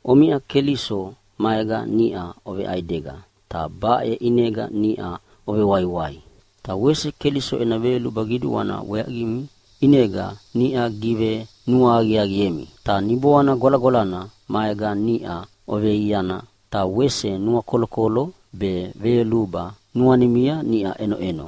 Omiʼa Keliso maega niʼa oveʼaidega ta baʼe ʼinega niʼa ovewaiwai. Ta wese Keliso ena veyoluba qiduana weaqimi ʼinega niʼa givenuahaqiaqiemi. Ta Niboana Gwalagwalana maega niʼa oveiaiana, ta wese nuakolokolo be veyoluba nuanimia niʼa ʼenoʼeno.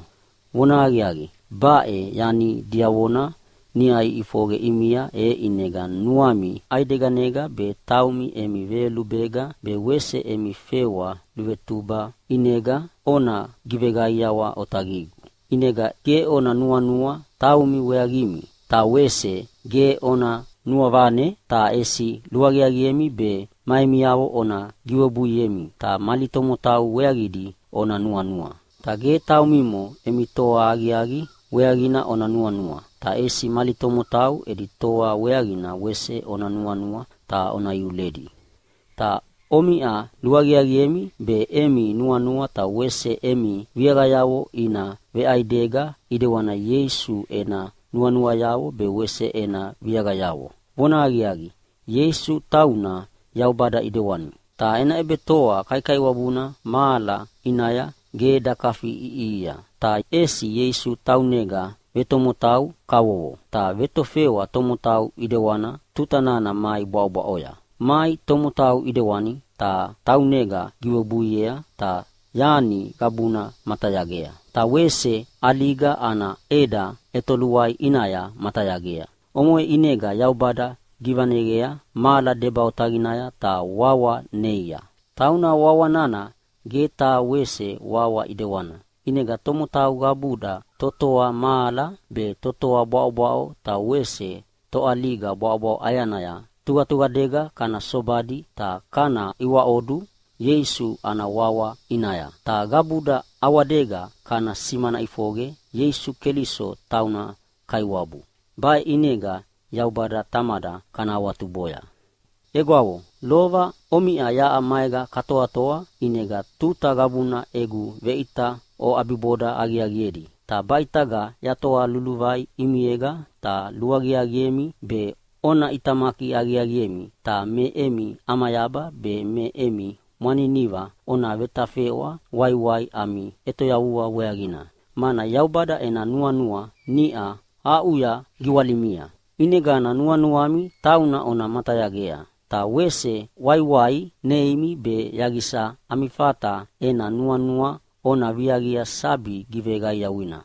Vonahaqiaqi, baʼe yani diavona niʼa iʼifoqe ʼimia, e ʼinega nuami ʼaideganega be taumi emi veyolubega be wese emi fewa luvetuba ʼinega ona giveqaiawa otaqigu. ʼInega ge ona nuanua taumi weaqimi ta wese ge ona nuavane. Ta ʼesi luaqiaqiemi be ma emiavo ona giwebuiemi ta mali tomotau weaqidi ona nuanua. Ta ge taumimo emi toa aqiaqi weaqina ona nuanua. Ta ʼesi mali tomotau edi toa weaqina wese ona nuanua ta ona iuledi. Ta omiʼa luaqiaqiemi be emi nuanua ta wese emi viaqayavo ina veʼaidega ʼidewani Ieisu ena nuanuayavo be wese ena viaqayavo. Vonahaqiaqi, Ieisu tauna Yaubada ʼidewani, ta ena ʼebetoa kaikaiwabuna mahala ʼinaya ge dakafiʼiʼihia. Ta ʼesi Ieisu taunega vetomotau kavovo, ta vetofewa tomotau ʼidewana tuta nana mai bwaʼobwaʼoya. Mai tomotau ʼidewani ta taunega giwebuiea ta yani qabuna matayagea, ta wese ʼaliga ana ʼeda ʼetoluai ʼinaya matayagea. Omoʼe ʼinega Yaubada givaneqea mahala deba otaqinaya ta wawa neia, tauna wawa nana ge taha wese wawa ʼidewana. ʼInegana tomotau qabuda totoa mahala be totoa bwaʼobwaʼo ta wese toʼaliga bwaʼobwaʼo ʼayanaya tuqatuqadega kana sobadi ta kana iwaʼodu Ieisu ana wawa ʼinaya. Ta qabuda ʼawadega kana simana ʼifoqe Ieisu Keliso tauna Kaiwabu. Baʼe ʼinega Yaubada Tamada kana awatuboya. Egwavo, lova omiʼa yaʼa maega katoatoa ʼinega tuta qabuna egu veʼita oʼabiboda aqiaqiedi. Ta baʼitaga yatoa luluvai ʼimiega ta luaqiaqiemi be ona ʼitamaki aqiaqiemi ta me emi ʼamayaba be me emi mwaniniva ona vetafeʼwa waiwai ami ʼetoyavua weaqina, mana Yaubada ena nuanua niʼa aʼuya giwalimia. ʼInegana nuanuami tauna ona matayagea. Ta wese waiwai neimi be yaqisa ami fata ena nuanua ona viaqia sabi giveqaiawana.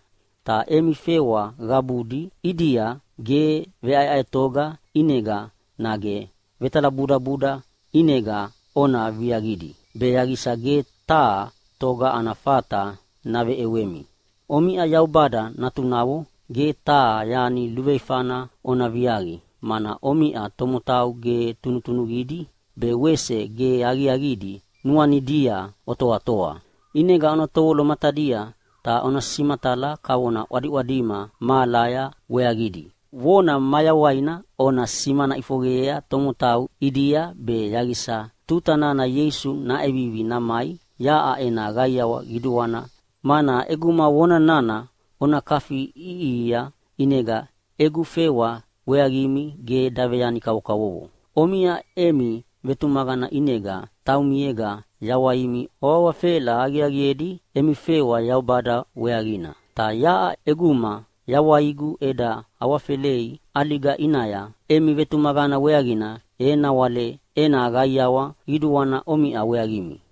Ta emi fewa qabudi ʼidia ge veʼaeʼaetoga ʼinega nage vetalabudabuda ʼinega ona viaqidi, be yaqisa ge taha toga ana fata naveʼewemi. Omiʼa Yaubada natunavo ge taha yani luveifana ona viaqi, mana omiʼa tomotau ge tunutunuqidi be wese ge aqiaqidi nuanidia otoatoa. ʼInega ona tovolo matadia ta ona simatala kavona ʼwadiʼwadima mahalaya weaqidi. Vona mayawaina ona simana ʼifoqeyea tomotau ʼidia be yaqisa tuta nana Ieisu naʼevivi namai yaʼa ena qaiawa qiduana, mana ʼeguma vona nana ona kafiʼiʼihia ʼinega egu fewa weaqimi ge daveyani kavokavovo. Omiʼa emi vetumaqana ʼinega taumiega yawaimi oawafela aqiaqiedi emi fewa Yaubada weaqina. Ta yaʼa ʼeguma yawaigu eda awafelei ʼaliga ʼinaya emi vetumaqana weaqina, e nawale ena qaiawa qiduana omiʼa weaqimi.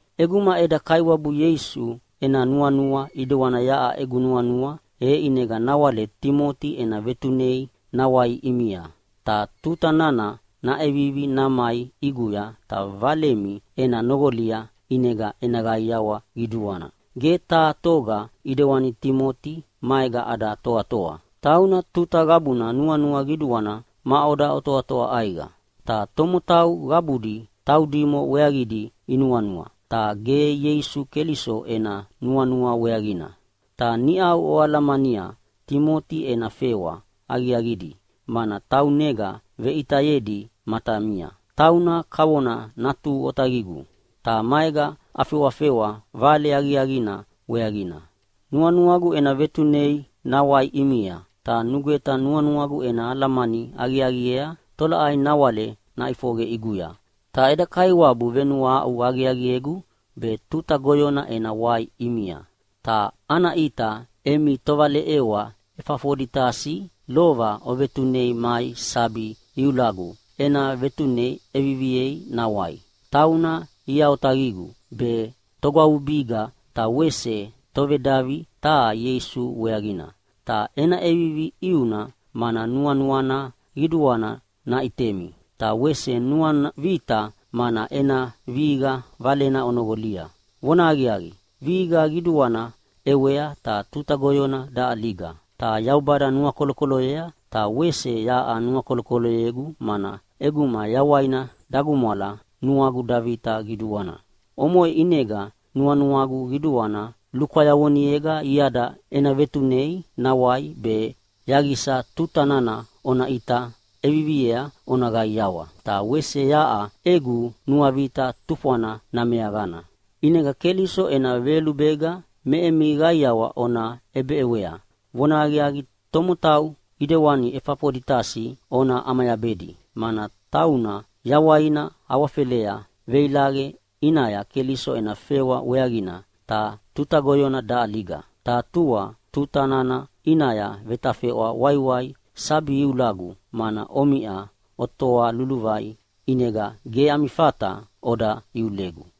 ʼEguma eda Kaiwabu Ieisu ena nuanua ʼidewani yaʼa egu nuanua, e ʼinega nawale Timoti ena vetunei nawai ʼimia. Ta tuta nana naʼevivi namai ʼiguya ta valemi ena noqolia, ʼinega ena qaiawa qiduana. Ge taha toga ʼidewani Timoti maega ada toatoa. Tauna tuta qabuna nuanua qiduana maʼoda otoatoa ʼaiqa. Ta tomotau qabudi taudimo weaqidi inuanua, ta ge Ieisu Keliso ena nuanua weaqina. Ta niʼau oalamania Timoti ena fewa aqiaqidi, mana taunega veʼitayedi matamia. Tauna kavona natu otaqigu, ta maega afewafewa Vale Aqiaqina weaqina. Nuanuagu ena vetunei nawai ʼimia, ta nugweta nuanuagu ena alamani aqiaqiea tolaʼai nawale naʼifoqe ʼiguya. Ta eda Kaiwabu venuahaʼu aqiaqiegu be tuta goyona ena wai ʼimia. Ta ana ʼita emi tovaleʼewa Efafoditasi lova ovetunei mai sabi iulagu ena vetune ʼeviviei nawai. Tauna ia otaqigu be togwavubiga ta wese tovedavi taha Ieisu weaqina. Ta ena ʼevivi ʼiuna, mana nuanuana qiduana naʼitemi. Ta wese nuana vita mana ena vihiqa valena onoqolia. Vonahaqiaqi, vihiqa qiduana ʼewea ta tuta goyona daʼaliga. Ta Yaubada nuakolokoloyea, ta wese yaʼa nuakolokoloyegu, mana ʼeguma yawaina dagumwala nuagu davita qiduana. Omoʼe ʼinega nuanuagu qiduana lukwayavonega iada ena vetunei nawai be yaqisa tuta nana ona ʼita ʼeviviea ona qaiawa, ta wese yaʼa egu nuavita tufwana nameaqana. ʼInega Keliso ena veyolubega me emi qaiawa ona ʼebeʼewea. Vonahaqiaqi, tomotau ʼidewani Efafoditasi ona ʼamayabedi, mana tauna yawaina awafelea veilaqe ʼinaya Keliso ena fewa weaqina, ta tuta goyona daʼaliga. Ta tua, tuta nana ʼinaya vetafeʼwa waiwai sabi iulagu, mana omiʼa otoa luluvai, ʼinega ge ami fata oda iulegu.